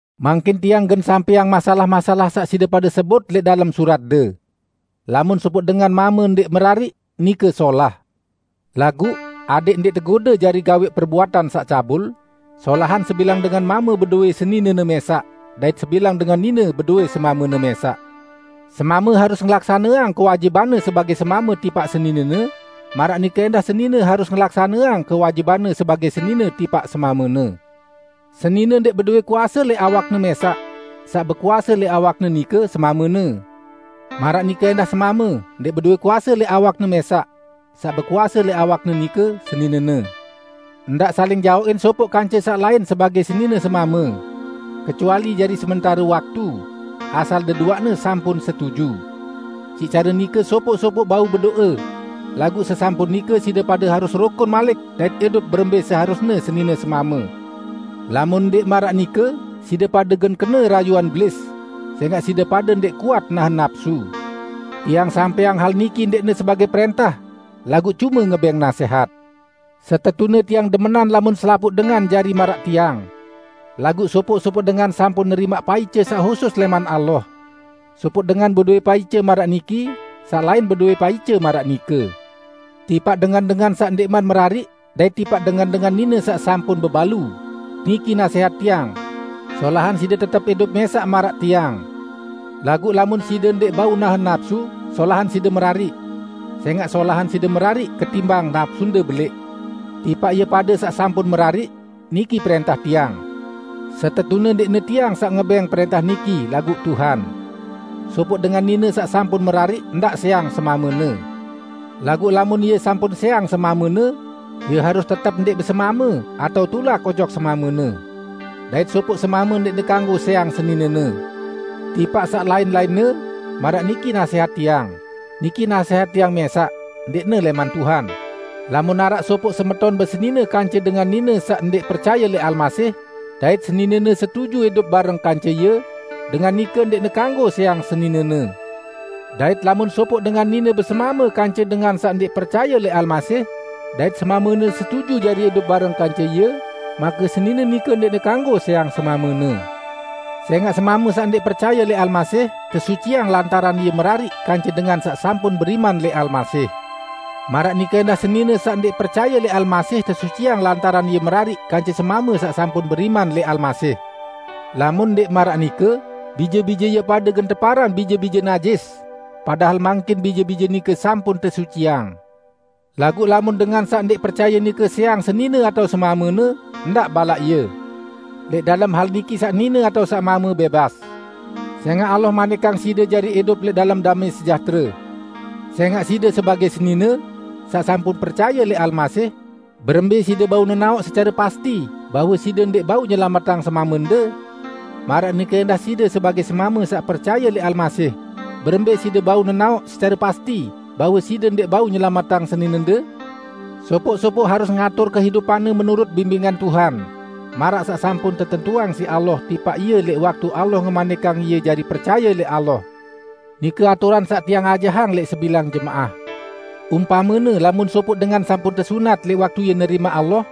Mangkin tiang gen sampẽang masalah-masalah saq side pade sebut lẽq dalem suratde. Lamun sopoq dengan mame ndẽq merariq, nike solah. Laguq, adẽq ndẽq tegode jari gawẽq perbuatan saq cabul, solahan sebilang dengan mame bedowẽ seninene mẽsaq, dait sebilang dengan nine bedowẽ semamene mẽsaq. Semame harus ngelaksaneang kewajibanne sebagẽ semame tipaq seninene, maraq nike ẽndah senine harus ngelaksaneang kewajibanne sebagẽ senine tipaq semamene. Senine ndẽq bedowẽ kuase lẽq awakne mẽsaq; saq bekuase lẽq awakne nike, semamene. Maraq nike ẽndah semame ndẽq bedowẽ kuase lẽq awakne mẽsaq; saq bekuase lẽq awakne nike, seninene. Ndaq saling jaoqin sopoq kance saq lain sebagẽ senine semame. Kecuali jari sementare waktu, asal deduaqne sampun setuju. Siq care nike sopoq-sopoq bau bedo'e. Laguq sesampun nike, side pade harus rukun malik dait idup berembẽ seharusne senine semame. Lamun ndẽq maraq nike, side pade gen kene rayuan Belis, sẽngaq side pade ndẽq kuat nahen napsu. Tiang sampẽang hal niki ndẽqne sebagẽ prẽntah, laguq cume ngebẽng nasẽhat. Setetune tiang demenan lamun selapuq dengan jari maraq tiang. Laguq sopoq-sopoq dengan sampun nerimaq paice saq husus lẽman Allah. Sopoq dengan bedowẽ paice maraq niki, saq lain bedowẽ paice maraq nike. Tipaq dengan-dengan saq ndẽqman merariq dait tipaq dengan-dengan nine saq sampun bebalu, niki nasẽhat tiang: Solahan side tetep idup mẽsaq maraq tiang. Laguq lamun side ndẽq bau nahen napsu, solahan side merariq. Sẽngaq solahan side merariq ketimbang napsunde belẽq. Tipaq ie pade saq sampun merariq, niki prẽntah tiang: (Setetune ndẽqne tiang saq ngebẽng prẽntah niki, laguq Tuhan.) Sopoq dengan nine saq sampun merariq ndaq sẽang semamene. Laguq lamun ie sampun sẽang semamene, ie harus tetep ndẽq besemame, atao tulak ojok semamene. Dait sopoq semame ndẽqne kanggo sẽang seninene. Tipaq saq lain-lainne, maraq niki nasẽhat tiang -- niki nasẽhat tiang mẽsaq, ndẽqne lẽman Tuhan -- lamun araq sopoq semeton besenine kance dengan nine saq ndẽq percaye lẽq Almasih, dait seninene setuju idup bareng kance ie, dengan nike ndẽqne kanggo sẽang seninene. Dait lamun sopoq dengan nine besemame kance dengan saq ndẽq percaye lẽq Almasih, dait semamene setuju jari idup bareng kance ie, make senine nike ndẽqne kanggo sẽang semamene. Sẽngaq semame saq ndẽq percaye lẽq Almasih tesuciang lantaran ie merariq kance dengan saq sampun beriman lẽq Almasih. Maraq nike ẽndah senine saq ndẽq percaye lẽq Almasih tesuciang lantaran ie merariq kance semame saq sampun beriman lẽq Almasih. Lamun ndẽq maraq nike, bije-bije ie pade gen teparan bije-bije najis, padahal mangkin bije-bije nike sampun tesuciang. Laguq lamun dengan saq ndẽq percaye nike sẽang senine atao semamene, ndaq balaq ie. Lẽq dalem hal niki saq nine atao saq mame bẽbas. Sẽngaq Allah manikang side jari idup lẽq dalem damẽ sejahtere. Sẽngaq side sebagẽ senine -- saq sampun percaye lẽq Almasih -- berembẽ side bau nenaoq secare pasti bahwe side ndẽq bau nyelametang semamende? Maraq nike ẽndah side sebagẽ semame saq percaye lẽq Almasih, berembẽ side bau nenaoq secare pasti bahwe side ndẽq bau nyelametang seninende? Sopoq-sopoq harus ngatur kehidupanne menurut bimbingan Tuhan, maraq saq sampun tetentuang siq Allah tipaq ie lẽq waktu Allah ngemanikang ie jari percaye lẽq Allah. Nike aturan saq tiang ajahang lẽq sebilang jemaah. Umpamene, lamun sopoq dengan sampun tesunat lẽq waktu ie nerimaq Allah,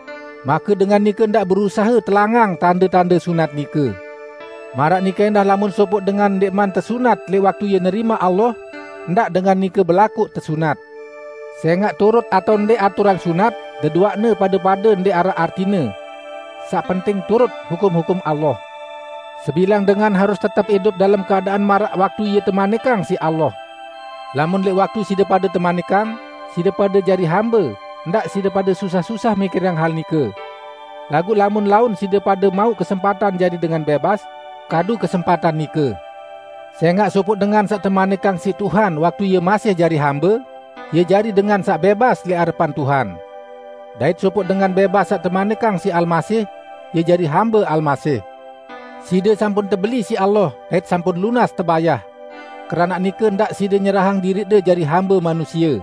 make dengan nike ndaq berusahe telangang tande-tande sunat nike. Maraq nike ẽndah lamun sopoq dengan ndẽqman tesunat lẽq waktu ie nerimaq Allah, ndaq dengan nike belakoq tesunat. Sẽngaq turut atao ndẽq aturan sunat, deduaqne pade-pade ndẽq araq artine. Saq penting turut hukum-hukum Allah. Sebilang dengan harus tetep idup dalem keadaan maraq waktu ie temanikang siq Allah. Lamun lẽq waktu side pade temanikang, side pade jari hambe, ndaq side pade susah-susah mikirang hal nike. Laguq lamun laun side pade mauq kesempatan jari dengan bẽbas, kadu kesempatan nike. Sẽngaq sopoq dengan saq temanikang siq Tuhan waktu ie masih jari hambe, ie jari dengan saq bẽbas lẽq arepan Tuhan. Dait sopoq dengan bẽbas saq temanikang siq Almasih, ie jari hambe Almasih. Side sampun tebeli siq Allah dait sampun lunas tebayah. Keranaq nike, ndaq side nyerahang diriqde jari hambe manusie.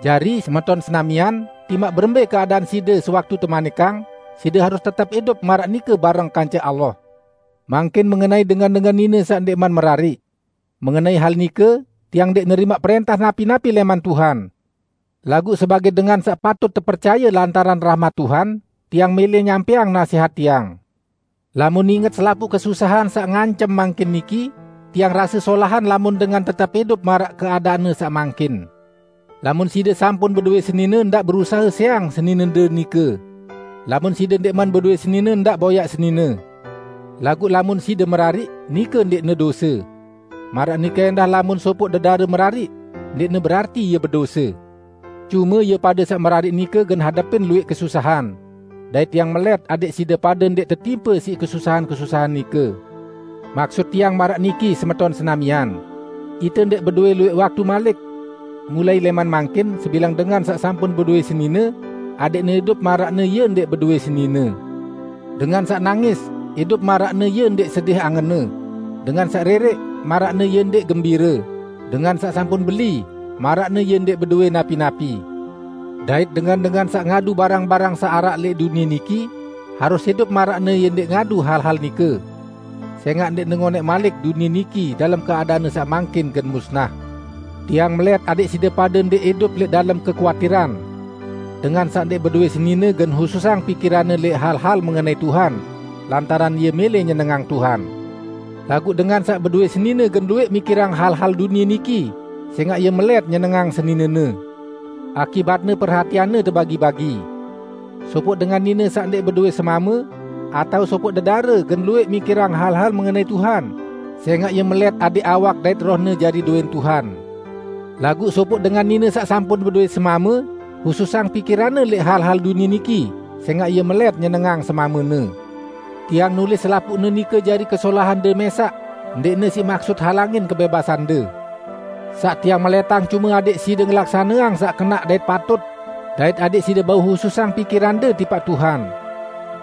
Jari, semeton senamian, timaq berembẽ keadaan side sewaktu temanikang, side harus tetep idup maraq nike bareng kance Allah. Mangkin mengenai dengan-dengan nine saq ndẽqman merariq. Mengenai hal nike, tiang ndẽq nerimaq prẽntah napi-napi lẽman Tuhan. Laguq sebagẽ dengan saq patut tepercaye lantaran rahmat Tuhan, tiang mẽlẽ nyampẽang nasẽhat tiang. Lamun inget selapuq kesusahan saq ngancem mangkin niki, tiang rase solahan lamun dengan tetep idup maraq keadaanne saq mangkin. Lamun side sampun bedowẽ senine ndaq berusahe sẽang seninende nike. Lamun side ndẽqman bedowẽ senine ndaq boyaq senine. Laguq lamun side merariq, nike ndẽqne dose. Maraq nike ẽndah lamun sopoq dedare merariq, ndẽqne berarti ie bedose. Cume, ie pade saq merariq nike gen hadepin luwẽq kesusahan. Dait tiang melẽt adẽq side pade ndẽq tetimpe siq kesusahan-kesusahan nike. Maksut tiang maraq niki, semeton senamian: Ite ndẽq bedowẽ luwẽq waktu malik. Mulai lẽman mangkin, sebilang dengan saq sampun bedowẽ senine, adẽqne idup maraqne ie ndẽq bedowẽ senine; dengan saq nangis, idup maraqne ie ndẽq sedih angenne; dengan saq rẽrẽq, maraqne ie ndẽq gembire; dengan saq sampun beli, maraqne ie ndẽq bedowẽ napi-napi; dait dengan-dengan saq ngadu barang-barang saq araq lẽq dunie niki, harus idup maraqne ie ndẽq ngadu hal-hal nike. Sẽngaq ndẽqne ngonẽq malik dunie niki, dalem keadaanne saq mangkin, gen musnah! Tiang melẽt adẽq side pade ndẽq idup lẽq dalem kekuatiran. Dengan saq ndẽq bedowẽ senine gen hususang pikiranne lẽq hal-hal mengenai Tuhan, lantaran ie mẽlẽ nyenengang Tuhan. Laguq dengan saq bedowẽ senine gen luwẽq mikirang hal-hal dunie niki, sẽngaq ie melẽt nyenengang seninene; akibatne perhatianne tebagi-bagi. Sopoq dengan nine saq ndẽq bedowẽ semame, atao sopoq dedare gen luwẽq mikirang hal-hal mengenai Tuhan, sẽngaq ie melẽt adẽq awak dait rohne jari dowẽn Tuhan. Laguq sopoq dengan nine saq sampun bedowẽ semame, hususang pikiranne lẽq hal-hal dunie niki, sẽngaq ie melẽt nyenengang semamene. Tiang nulis selapuqne nike jari kesolahande mẽsaq, ndẽqne siq maksut halangin kebẽbasande. Saq tiang melẽtang cume adẽq side ngelaksaneang saq kenaq dait patut, dait adẽq side bau hususang pikirande tipaq Tuhan.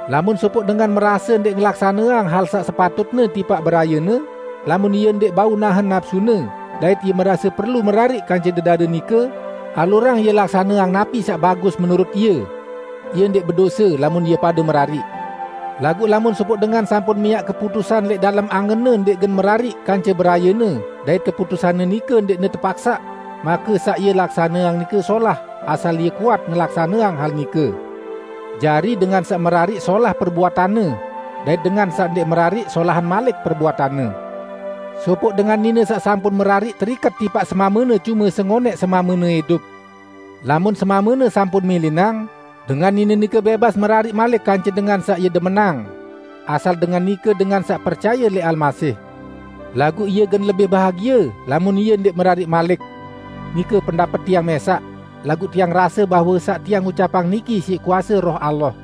Lamun sopoq dengan merase ndẽq ngelaksaneang hal saq sepatutne tipaq berayene, lamun ie ndẽq bau nahen napsune, dait ie merase perlu merariq kance dedare nike, alurang ie laksaneang napi saq bagus menurut ie. Ie ndẽq bedose, lamun ie pade merariq. Laguq lamun sopoq dengan sampun miaq keputusan lẽq dalem angenne ndẽq gen merariq kance berayene dait keputusanne nike ndẽqne tepaksaq, make saq ie laksaneang nike solah, asal ie kuat ngelaksaneang hal nike. Jari, dengan saq merariq solah perbuatanne, dait dengan saq ndẽq merariq solahan malik perbuatanne. Sopoq dengan nine saq sampun merariq teriket tipaq semamene cume sengonẽq semamene idup. Lamun semamene sampun milinang, dengan nine nike bẽbas merariq malik kance dengan saq ie demenang; asal dengan nike dengan saq percaye lẽq Almasih. Laguq ie gen lebih bahagie lamun ie ndẽq merariq malik. Nike pendapet tiang mẽsaq, laguq tiang rase bahwe saq tiang ucapang niki siq kuase Roh Allah.